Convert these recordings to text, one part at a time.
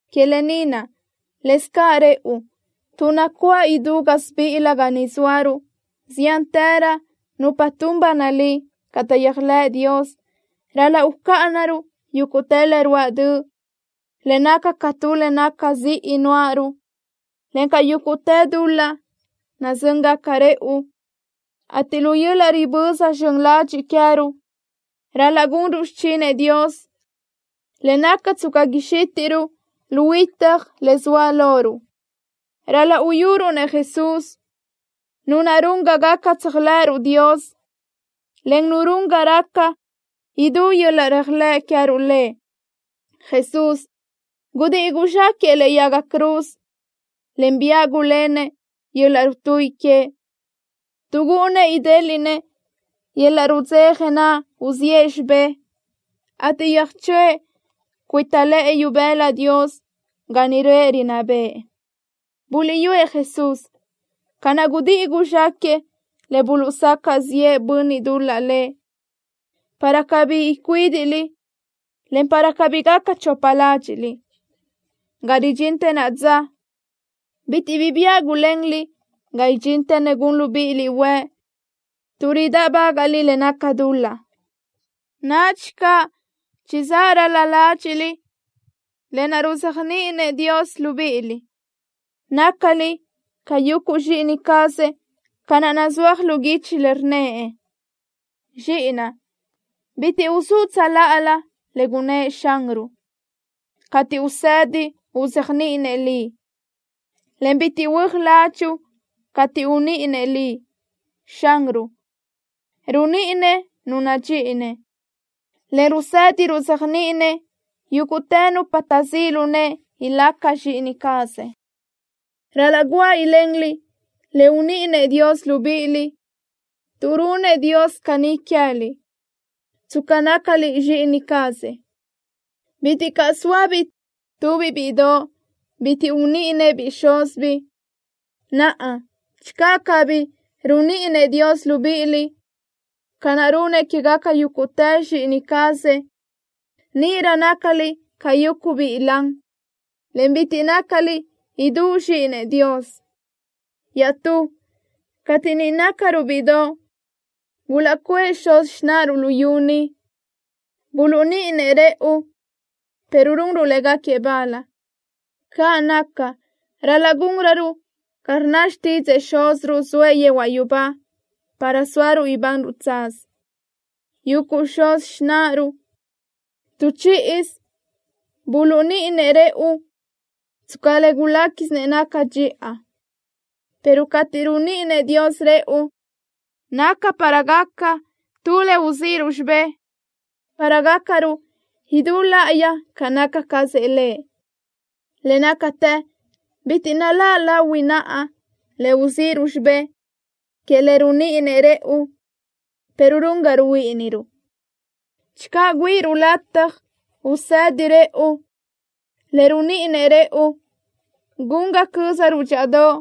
Que lë ni naʼ, lëscaʼ rëʼu, tuʼ nacuáʼ idú gásibiʼilö ga ni zóaruʼ ziántërö nupa tun ba nalí ca taʼyéajlëʼ Dios, ral-laʼ ucáʼanaruʼ yúguʼtë le ruáʼ döʼ le naca ca tu le naca ziʼi nuáʼaruʼ, encaʼ yúguʼtë dul-laʼ nazö́ngaca rëʼu, ateʼ lu yöl-laʼ riböza zxön ladxiʼ queë́ruʼ, ral-laʼ gunruʼ xichinëʼ Dios, le naca tsca xítiʼruʼ lu huitaj le zoa loruʼ. Ral-laʼ uyuruʼ-nëʼ Jesús, Nu naʼ run ga gaca tséajlëʼëruʼ Dios, en Nu run ga raca idú yöl-laʼ réajlëʼ queë́ruʼ Lëʼ. Jesús gudíʼi guzxáquëʼë lëʼe yaga cruz, en biáʼ gulénëʼ yöl-laʼ rutuíʼi que, tuʼ gúʼunnëʼ idéliʼnëʼ yöl-laʼ rudzeja naʼ uziʼë xibé, ateʼ yöjchöʼë cuita lëʼë ibëla Dios, ga niʼ röʼë rinná bëʼë. Buliʼyúëʼ Jesús, ca naʼ gudíʼi guzxáquëʼë le buluʼsacaʼ ziʼë bönniʼ dul-laʼ Lëʼ, para cabí icuídiʼliʼ, en para cabí gaca chopa ládxiʼliʼ. Ga ridxintë naʼa dza, bitiʼ bi biáʼ gulenliʼ ga idxintë nu gun libíʼiliʼ huëʼ tuʼ ridáʼbagaʼliʼ le naca dul-laʼ. Nadxi caʼ chizáʼ ral-la ládxiʼliʼ lë naʼ ruzéajniʼinëʼ Dios libíʼiliʼ. Nácaliʼ ca yuguʼ zxíʼini cazëʼ, ca naʼ nazúaj lu guichi le rnnëʼ: Zxíʼinaʼ, bitiʼ uzúʼ tsöláʼalö le gunëʼ Xanruʼ, cateʼ usëdi uzéajniʼinëʼ liʼ, en bitiʼ huö́aj ládxuʼu cateʼ uníʼinëʼ liʼ. Xanruʼ runíʼinëʼ nu nadxíʼinëʼ, en rusëdi ruzéajniʼinëʼ yúguʼtë nupa taʼzíʼ lu nëʼe ilaca zxíʼini cazëʼ. Ral-laʼ guáʼ ilenliʼ le uníʼinëʼ Dios libíʼiliʼ, tuʼ runëʼ Dios caní queë́liʼ tsca nácaliʼ zxíʼini cazëʼ. Bitiʼ caʼ zóabiʼ tubiʼ bíʼidoʼ bitiʼ uníʼinëʼ-biʼ xúzibiʼ. Naʼa, channö cabí runíʼinëʼ Dios libíʼiliʼ ca naʼ runëʼ quégaca yúguʼtë zxíʼini cazëʼ, níʼirö nácaliʼ ca yuguʼ biʼi lan, en bitiʼ nácaliʼ idú zxíʼinëʼ Dios. Iaʼstú, cateʼ niʼ nácaruʼ bíʼidoʼ, gulaʼcuʼë xuz xináʼaruʼ luyú ni, buluʼníʼinëʼ rëʼu, pero runruʼ légaquiëʼ bal. Caʼ naca, ral-laʼ gúnröruʼ ca rnna xtídzëʼë Xúziruʼ zoëʼ yehuaʼ yubá para sóaruʼ ibanruʼ tsaz. Yuguʼ xuz xináʼaruʼ, tu chíʼisö buluʼníʼinëʼ rëʼu tsca le guléquisinëʼ naca dxiʼa, pero cateʼ runíʼinëʼ Dios rëʼu, naca para gaca tu le uzíʼiruʼ xibé, para gácaruʼ idú láʼayi ca naca cazëʼ Lëʼ. Le nácatë bitiʼ naláʼ lahui naʼa le uzíʼiruʼ xibé que le runíʼinëʼ rëʼu, pero run ga ruhuíʼiniruʼ. Channö güíʼiruʼ lataj usëdi rëʼu le runíʼinëʼ rëʼu, gun ga cö́zaruʼ dxíʼadoʼ,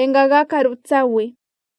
en ga gácaruʼ tsahuiʼ.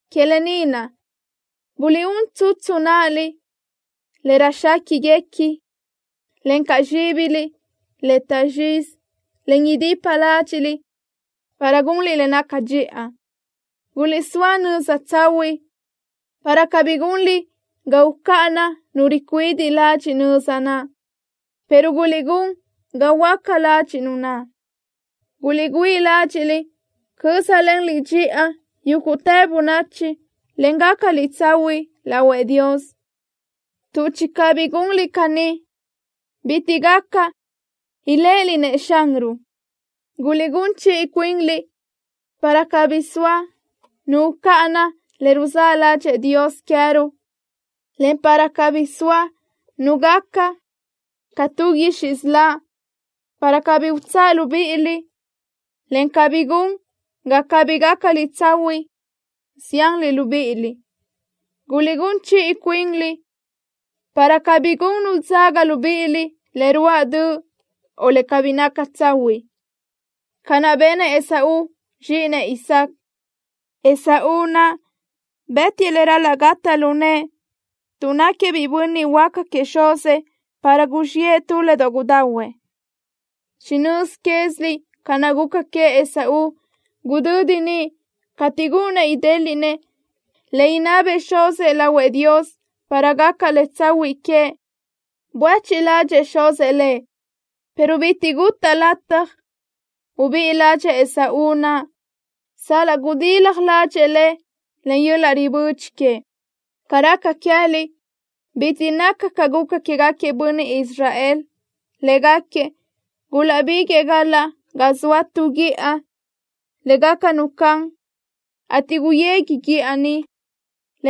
Que lë ni naʼ buliʼún tsutsu náʼaliʼ le röjxéquiʼguequi, encaʼ zxíbiliʼ le taʼzxizi, en idipa ládxiʼliʼ para gunliʼ le naca dxiʼa. Guliʼsóa nöza tsahuiʼ, para cabí gunliʼ ga ucáʼana nu ricuidiʼ ladxiʼ nöza naʼ, pero guliʼgún ga huöáca ladxiʼ nu naʼ. Guliʼgüíʼ ládxiʼliʼ cö́zalenliʼ dxiʼa yúguʼtë bönachi, en gácaliʼ tsahuiʼ lahuëʼ Dios, tuʼ channö cabí gunliʼ caní, bitiʼ gaca iléʼeliʼ-nëʼ Xanruʼ. Guliʼgún chiʼi cuinliʼ para cabí soa nu ucáʼana le ruzáʼ ládxëʼë Dios queë́ruʼ, en para cabí soa nu gaca ca tu guixiʼ siláʼ, para cabí utsáʼ libíʼiliʼ, en cabí gun ga cabí gácaliʼ tsahuiʼ zianliʼ libíʼiliʼ. Guliʼgún chiʼi cuinliʼ para cabí gun nu dzaga libíʼiliʼ le ruáʼ döʼ, o le cabí naca tsahuiʼ, ca naʼ benëʼ Esaú, zxíʼinëʼ Isáac. Esaú naʼ bë́tiʼë le ral-laʼ gataʼ lu nëʼë tuʼ náquiëʼ biʼi bönniʼ huaca queëʼ xuzëʼ para guzxiʼë tu le doʼ gudahuëʼ. Chinö́z quéziliʼ ca naʼ guca queëʼ Esaú gudödi niʼ cateʼ gúʼunnëʼ idéliʼnëʼ le inabëʼ xuzëʼ lahuëʼ Dios para gaca le tsahuiʼ queëʼ. Buéchiʼ ládxëʼë xuzëʼ lëʼ, pero bitiʼ gutaʼ lataj ubíʼi ládxëʼë Esaú naʼ sal-laʼ gudilaj ládxëʼë le len yöl-laʼ ribödxi queëʼ. Ca raca queë́liʼ bitiʼ naca ca guca quégaquiëʼ bönniʼ Israel. Légaquiëʼ gulaʼbiguëʼë galaʼ ga zoa tu guíʼa le gaca nu can, ateʼ guyegui guíʼa niʼ,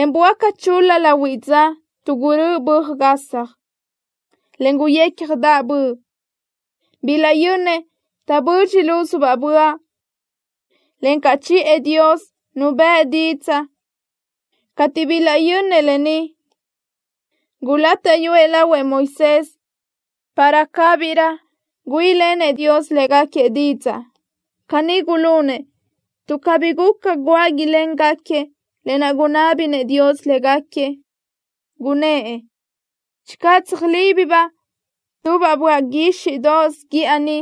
en böáca chul-la lahuiʼ dza tuʼ gurö́ʼö böaj gasaj, en guyécjadaʼ böʼ. Bilaʼyönnëʼ taʼbödxi lúzubaʼ böaʼ, encaʼ chiʼë Dios Nu bëʼ didzaʼ. Cateʼ bilaʼyönnëʼ lë ni, gulátaʼyuëʼ lahuëʼ Moisés para cabirö güíʼilenëʼ Dios légaquiëʼ didzaʼ. Caní gulunëʼ tuʼ cabí guca guáʼ iléngaquiëʼ lë naʼ gunná béʼenëʼ Dios légaquiëʼ, gunnë́ʼ: “Channö tsöjlíbibaʼ tubaʼ böaʼ guíxiʼdoʼos guíʼa ni,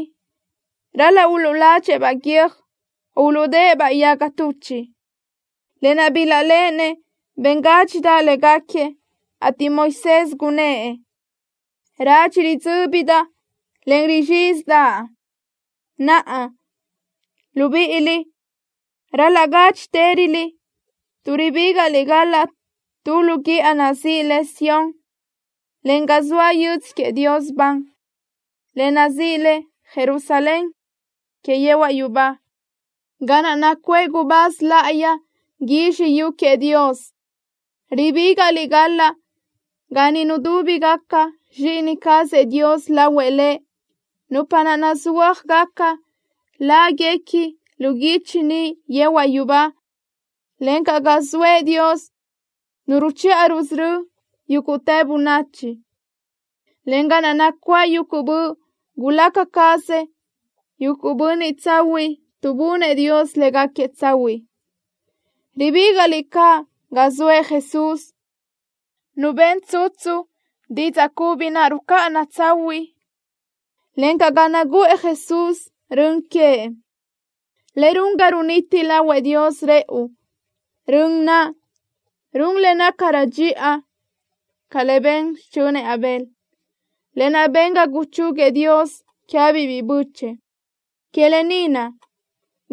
ral-laʼ uluʼládxëʼë-baʼ guiö́j, o uluʼdödëʼ-baʼ yaga tuchiʼ.” Lë naʼ bilaʼléʼenëʼ ben gádxidaʼ légaquiëʼ, ateʼ Moisés gunnë́ʼ: “Radxi ridzö́bidaʼ, en rizxízidaʼa.” Naʼa, libíʼiliʼ ral-laʼ gádxitëröliʼ tuʼ ribígaʼliʼ galaʼ tu lu guíʼa nazíʼi le Sión, en ga zoa yödzö queëʼ Dios ban, le nazíʼi le Jerusalén que yehuaʼ yubá, ga naʼ nacuʼë gubáz láʼayi guizxi yu queëʼ Dios. Ribígaʼliʼ galaʼ ga niʼ nudúbigaca zxíʼini cazëʼ Dios lahuëʼ Lëʼ, nupa naʼ nazúajgaca láguequi lu guichi niʼ yehuaʼ yubá, encaʼ ga zoëʼ Dios Nu ruchiʼa rusörö́ëʼ yúguʼtë bönachi, en ga naʼ nacuáʼ yuguʼ böʼ gulaca cazëʼ yuguʼ bönniʼ tsahuiʼ, tuʼ bunëʼ Dios légaquiëʼ tsahuiʼ. Ribígaʼliʼ caʼ ga zoëʼ Jesús, Nu ben tsutsu didzaʼ cubi naʼ rucáʼana tsahuiʼ, encaʼ ga naguʼë Jesús rön queëʼ le run ga runiti lahuëʼ Dios rëʼu, rön naʼ run le nácarö dxiʼa ca le ben xichönëʼ Abel, lë naʼ ben ga guchúguiëʼ Dios queë́biʼ biʼi bö́chëʼë. Que lë ni naʼ,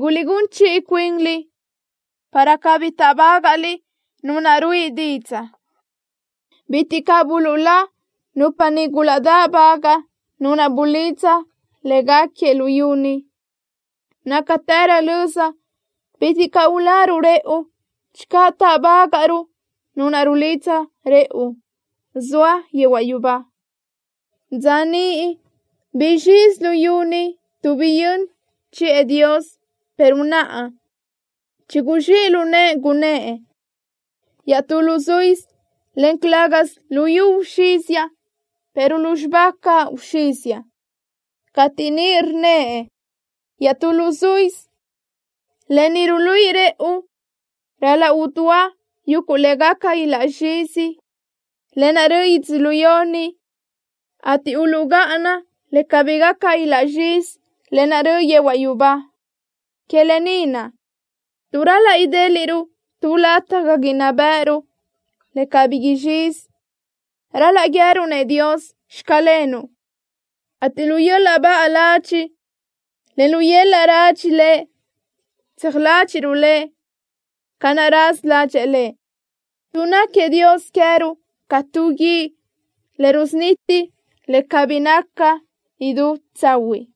guliʼgún chiʼi cuinliʼ para cabí táʼbagaʼliʼ Nu naʼ ruíʼi didzaʼ. Bitiʼ caʼ buluʼlá nupa niʼ gulaʼdáʼbagaʼ nu naʼ bulidza légaquiëʼ luyú ni. Nácatërö löza bitiʼ caʼ uláruʼ rëʼu channö táʼbagaʼruʼ Nu naʼ rulidza rëʼu, zoëʼ yehuaʼ yubá. Dza niʼ guzxizi luyú ni tuʼ biyö́n chiʼë Dios, pero naʼa chiguzxíʼ lu nëʼë, gunnë́ʼ: “Iaʼtú luzuísö, en calë́gasö luyú uxíziaʼ, pero lúzxiba caʼ uxíziaʼ.” Cateʼ niʼ rnnëʼ: “Iaʼtú luzuísö”, lë ni ruluíʼi rëʼu ral-laʼ udúa yuguʼ le gaca ilaʼzxízi, lë naʼ röʼö yödzölió ni, ateʼ uluʼgáʼana le cabí gaca ilaʼzxízi, lë naʼ röʼ yehuaʼ yubá. Que lë ni naʼ, tuʼ ral-laʼ idéliʼruʼ tu lataj ga inná bë́ʼëruʼ, le cabí izxizi, ral-laʼ guië́ruʼ-nëʼ Dios: “Xclenuʼ”, ateʼ lu yöl-laʼ baʼa ladxiʼ, en lu yöl-laʼ radxi Lëʼ tseaj ládxiʼruʼ Lëʼ ca naʼ raza ládxëʼë Lëʼ, tuʼ náquiëʼ Dios queë́ruʼ ca tu guíʼ le rusuniti le cabí naca idú tsahuiʼ.